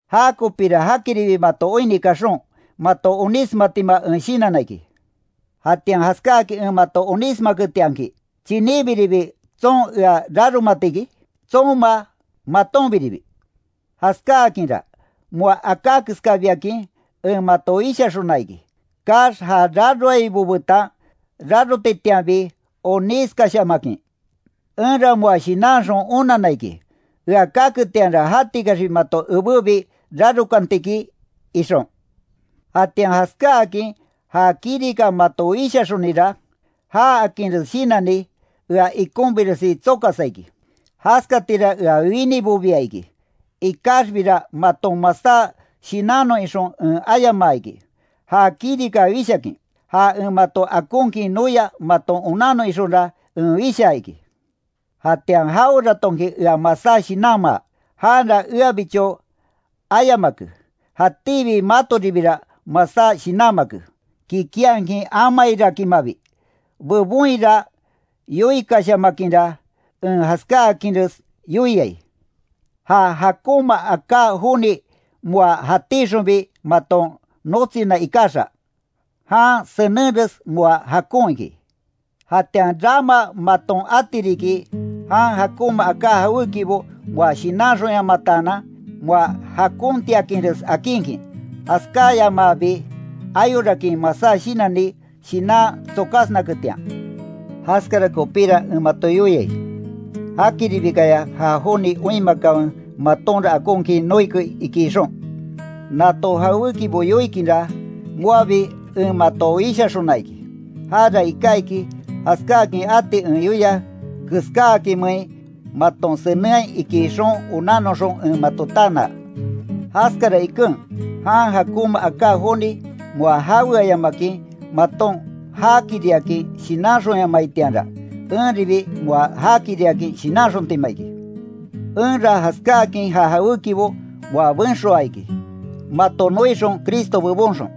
Jakopira jakiribi mato oinni kaxon, mato onísmatima en shinanna iki. Jatian jaskáakin en mato onísmaketianki, ¿Chiníbiribi tson ea raromatiki? Tsonma, matonbiribi. Jaskáakinra, moa aká keskabiakin, en mato wishaxona iki, kaax ja raroaibo betan rarotitianbi onískashamakin. Enra moa shinanxon onanna iki, ea kaketianra jatikaxbi mato ebébi, rarokanti iki ixon. Jatian jaskáakin ja kirika mato wishaxonira, jaakinres shinanni, ea ikonbiresi tsokasa iki, jaskatira ea winibobia iki, ikaxbira maton masá shinannon ixon en ayamaa iki, ja kirika wishakin, ja en mato akonkin noia maton onannon ixonra en wishaa iki. Jatian jaweratonki ea masá shinanmaa, janra eabicho amayamake, jatíbi matoribira masá shinanmake kikinhakin amairakinmabi, bebonhira yoikashamakinra, en jaskáakinres yoiai. Ja jakonma aká joni moa jatíxonbi maton notsina ikaxa, jan senenres moa jakon iki. Jatian rama maton ati riki, jan jakonma aká jawékibo moa shinanxonyamataanan, moa jakontiakinres akinkin, jaskáyamaabi ayorakin masá shinanni, shinan tsokasnaketian. Jaskara kopíra en mato yoiai, jakiribikaya ja joni oinmakanwe, matonra akonkin noike iki ixon. Nato jawékibo yoikinra, moabi en mato wishaxona iki, jara iká iki, jaskáakin ati en yoia keskáakinmein maton senenhai iki ixon onannoxon en mato tanaa. Jaskara iken, jan jakonma aká joni moa jaweayamakin maton jakiriakin shinanxonyamaitianra, enribi moa jakiriakin shinanxontima iki. Enra jaskáakin ja jawékibo moa benxoa iki, mato noixon Cristo bebonxon.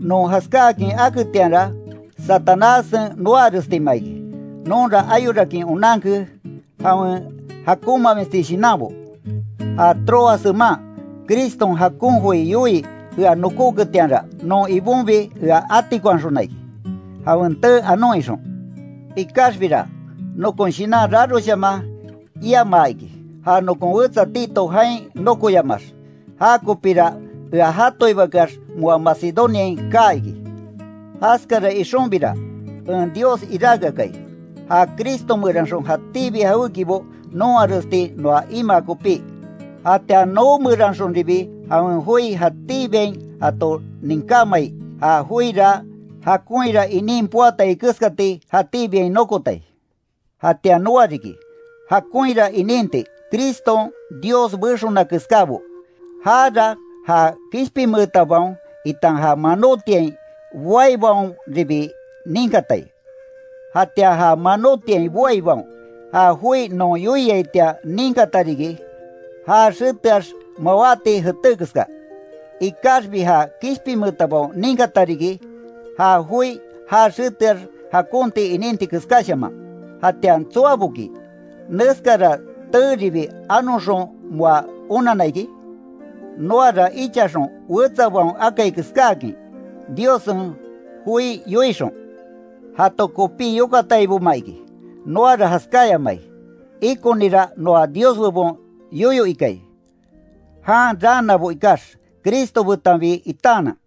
Non jaskáakin aketianra, Satanássen noarestima iki, nonra ayorakin onanke jawen jakonmamisti shinanbo. Ja Troas jeman, Criston jakon joi yoii ea nokoketianra, non Ibonbi ea atikonhaxona iki, jawen tee anon ixon. Ikaxbira, nokon shinan raroshaman iamaa iki, ja nokon wetsa Tito jain nokoyamaax, jakopíra ea jatoibakeax, moa Macedoniain kaa iki. Jaskara ixonbira, en Dios iráke akai, ja Cristo meranxon jatíbi jawékibo nonharesti noa imaa kopí, jatian noo meranxonribi jawen joi jatíbiain jato ninkámai, ja joira jakonhira inin poatai keskati, jatíbiain nokotai. Jatian noa riki, jakonhira ininti Criston Dios bexona keskábo, jara ja kishpinmeetabaon itan ja manotiain boaibaonribi ninkatai. Jatian ja manótiain boaibaon, ja joi non yoiaitian ninkata riki, ja xeteax mawáti jeté keska, ikaxbi ja kishpinmeetabaon ninkata riki, ja joi ja xeteax jakonti ininti keskáshaman. ¿Jatian tsoaboki, neskara teeribi anoxon moa onanna iki? Noara ichaxon wetsabaon akai keskáakin, Diossen joi yoixon, jato kopí yokataiboma iki, noara jaskáyamai, ikonira noa Dios bebon yoyo ikai, jan raanabo ikax, Cristo betanbi itaanan.